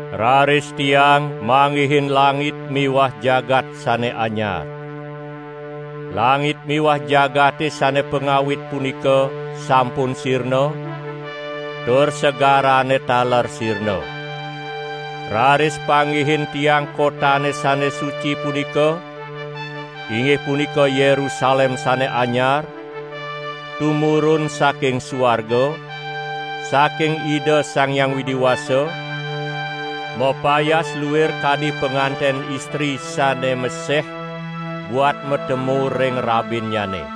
Raris tiang manggihin langit miwah jagat sane anyar. Langit miwah jagate sane pangawit punika sampun sirna, tur segarane taler sirna. Raris panggihin tiang kotane sane suci punika, inggih punika Yerusalem sane anyar, tumurun saking suarga, saking Ida Sang Hyang Widi Wasa, mapayas luir kadi panganten istri sane meseh buat matemu ring rabinnyane.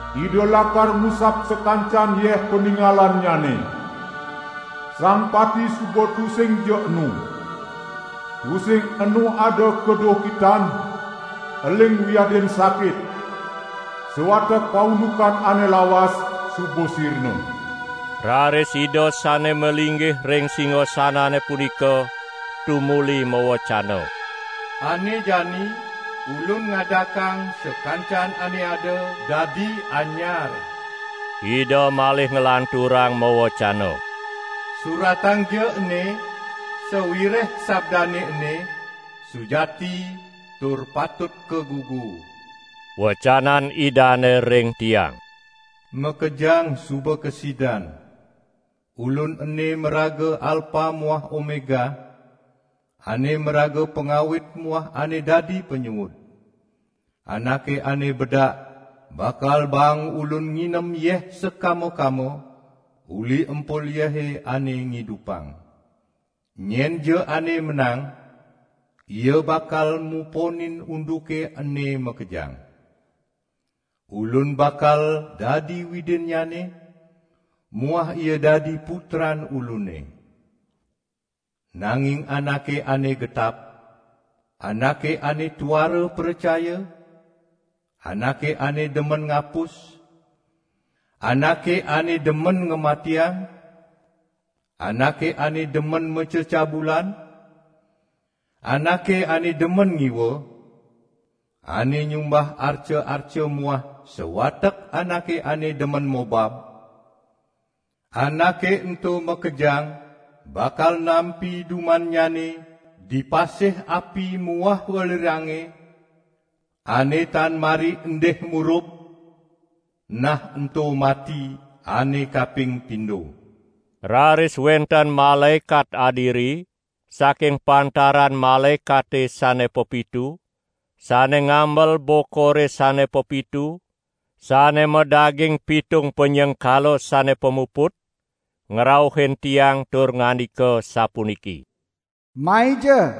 Ida lakar ngusap sakancan yeh paningalannyane. Sang pati suba tusingja enu. Tusing enu ada kaduhkitan, eling wiadin sakit. Sawatek paundukan ane lawas suba sirna." Raris Ida sane malinggih ring singasanane punika tumuli mawecana: "Ane jani Ulun ngadakang sakancan ane ada, dadi anyar." Ida malih nglanturang mawecana: "Suratangja ene, sawireh sabdane ene sujati tur patut kagugu." Wecanan Idane ring tiang: "Makejang suba kasidan. Ulun ene maraga Alpa muah Omega, ane maraga Pangawit muah ane dadi Panyuud. Anake ane bedak bakal baang Ulun nginem yeh sakama-kama uli empul yehe ane ngidupang. Nyenja ane menang, ia bakal muponin unduke ene makejang. Ulun bakal dadi Widinnyane muah ia dadi putran Ulune. Nanging anake ane getap, anake ane tuara pracaya, anake ane demen ngapus, anake ane demen ngamatiang, anake ane demen macecabulan, anake ane demen ngiwa, ane nyumbah arca-arca muah sawatek anake ane demen mobab, anake ento makejang bakal nampi dumannyane di pasih api muah welirange ane tan mari endih murub, nah ento mati ane kaping pindo." Raris wenten malaekat adiri saking pantaran malaekate sane pepitu, sane ngamel bokore sane pepitu, sane madaging pitung panyengkala sane pamuput, ngrauhin tiang tur ngandika sapuniki: "Maija,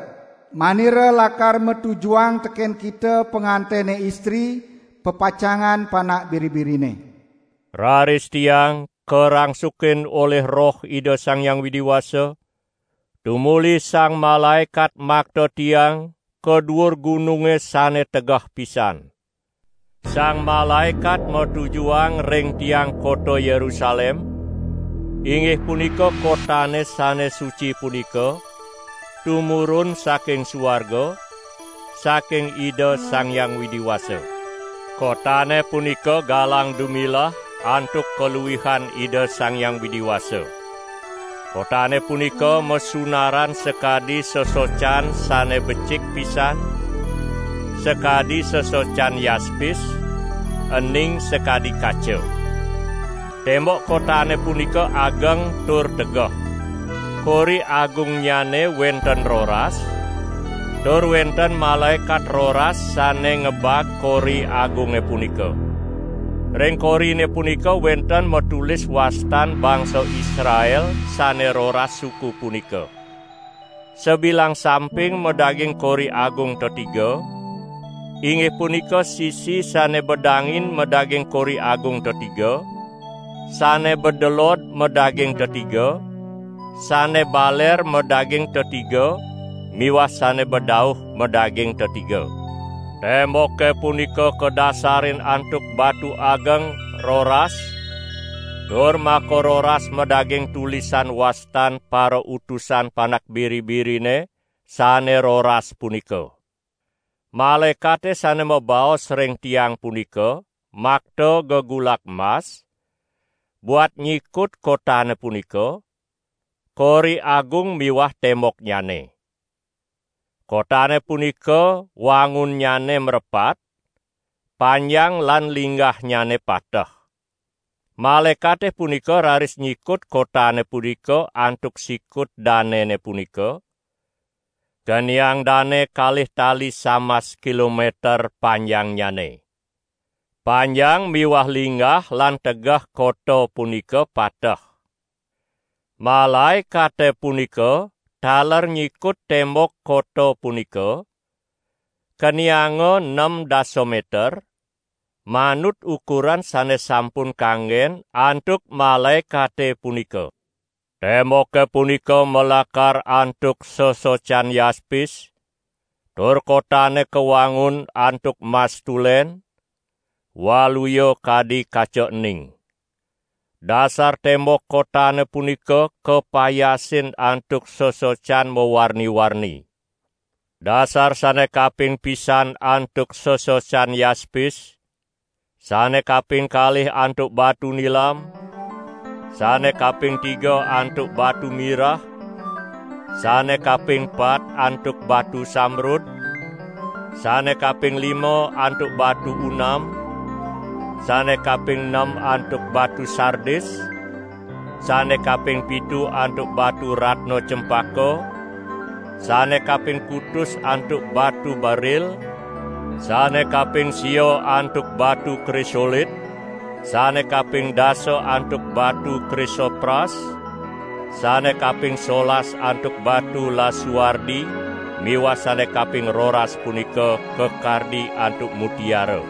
manira lakar matujuhang teken kita pangantene istri, pepacangan Panak Biri-birine." Raris tiang karangsukin olih Roh Ida Sang Hyang Widi Wasa, tumuli sang malaekat makta tiang ka duur gununge sane tegeh pisan. Sang malaekat matujuhang ring tiang kota Yerusalem, inggih punika kotane sane suci punika, tumurun saking suarga, saking Ida Sang Hyang Widi Wasa. Kotane punika galang dumilah antuk kaluihan Ida Sang Hyang Widi Wasa. Kotane punika masunaran sakadi sesocan sane becik pisan, sakadi sesocan yaspis, ening sakadi kaca. Tembok kotane punika ageng tur tegeh. Kori agungnyane wenten roras, tur wenten malaekat roras sane ngebag kori agunge punika. Ring korine punika wenten matulis wastan bangsa Israel sane roras suku punika. Sabilang samping madaging kori agung tetiga, inggih punika sisi sane bedangin madaging kori agung tetiga, sane bedelod madaging tetiga, sane baler madaging tetiga miwah sane bedauh madaging tetiga. Temboke punika kadasarin antuk batu ageng roras tur makaroras madaging tulisan wastan parautusan Panak Biri-birine sane roras punika. Malaekate sane mabaos ring tiang punika makta gegulak mas, buat nyikut kotane punika, kori agung miwah temboknyane. Kotane punika wangunnyane mrepat, panjang lan linggahnyane pateh. Malaekate punika raris nyikut kotane punika antuk sikut danene punika, keniang dane kalih tali samas kilometer panjangnyane. Panjang miwah linggah lan tegeh kota punika pateh. Malaekate punika taler nyikut tembok kota punika, kenianga nem dasa meter, manut ukuran sane sampun kanggen antuk malaekate punika. Temboke punika malakar antuk sesocan yaspis tur kotane kawangun antuk mas tulen, waluya kadi kaca ening. Dasar tembok kotane punika kapayasin antuk sesocan mawarni-warni. Dasar sane kaping pisan antuk sesocan yaspis, sane kaping kalih antuk batu nilam, sane kaping tiga antuk batu mirah, sane kaping pat antuk batu sambrud, sane kaping lima antuk batu unam, sane kaping nem antuk batu sardis, sane kaping pitu antuk batu ratna cempaka, sane kaping kutus antuk batu beril, sane kaping sia antuk batu krisolit, sane kaping dasa antuk batu krisopras, sane kaping solas antuk batu lasuardi miwah sane kaping roras punika kakardi antuk mutiara.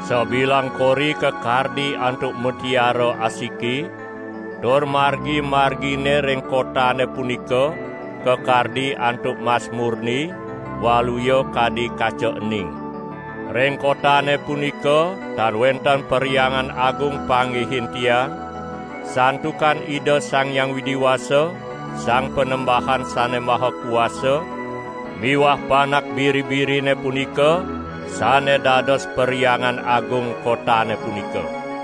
Sabilang kori kakardi antuk mutiara asiki. Tur margi-margine ring kotane punika kakardi antuk mas murni waluya kadi kaca ening. Ring kotane punika tan wenten Perhyangan Agung panggihin tiang, santukan Ida Sang Hyang Widi Wasa, Sang Panembahan Sane Maha Kuasa miwah Panak Biri-birine punika sane dados Perhyangan Agung kotane punika.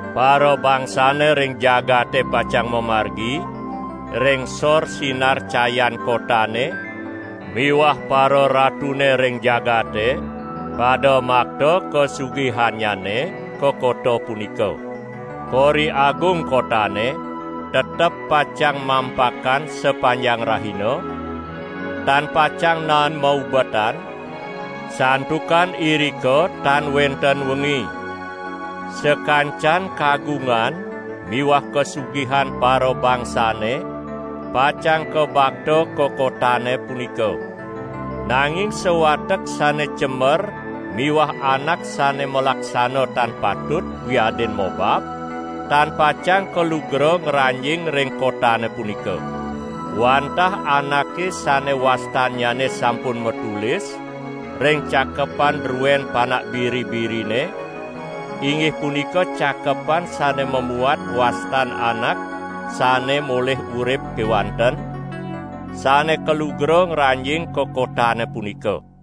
Parabangsane ring jagate pacang mamargi ring sor sinar cayan kotane miwah pararatune ring jagate pada makta kasugihannyane ka kota punika. Kori agung kotane tetep pacang mampakan sapanjang rahina, tan pacang naen maubetan, santukan irika tan wenten wengi. Sakancan kagungan miwah kasugihan parabangsane pacang kabakta ka kotane punika. Nanging sawatek sane cemer miwah anak sane malaksana tan patut wiadin mobab, tan pacang kalugra ngranjing ring kotane punika. Wantah anake sane wastannyane sampun matulis ring cakepan druen Panak Biri-birine inggih punika cakepan sane mamuat wastan anak sane molih urip kewanten, sane kalugra ngranjing ka kotane punika.